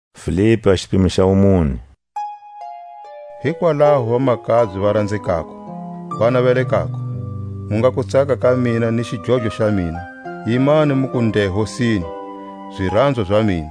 Tsakani Hosini. Hikwalaho vamakabye va ranzekako, va navelekako, mu nga kutsaka ka mina ni xidlodlo xa mina, yimani muku nde Hosini, ziranzwa za mina.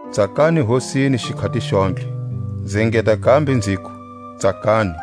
Tsakani Hosini xikhati xontlhe; nzi engeta kambe nziku, Tsakani!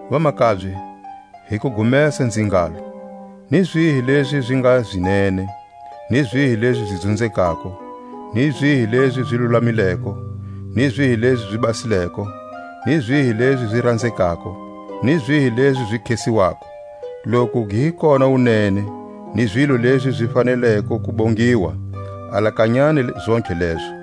Vamakabye, hi kugumesa nzi ngalo: Ni zihi lezi zi nga zi nene, ni zihi lezi zi dzunzekako, ni zihi lezi zi lulamileko, ni zihi lezi zi basileko, ni zihi lezi zi ranzekako, ni zihi lezi zi khesiwako; loku gi hi kona wunene, ni zilo lezi zi faneleko ku bongiwa, alakanyani zontlhe lezo.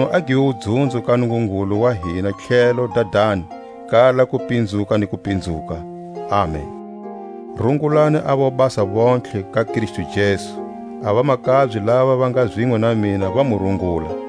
Makunu a give wudzunzo ka Nungungulu wa hina thlelo Dadani, kala kupinzuka ni kupinzuka. Amen! Rungulani a vobasa vontlhe ka Kristu Jesu. A vamakabye lava va nga zinwe na mina va mu rungula.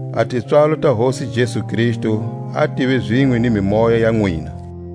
A tipswalo ta Hosi Jesu Kristu a tive zinwe ni mimoya ya nwina.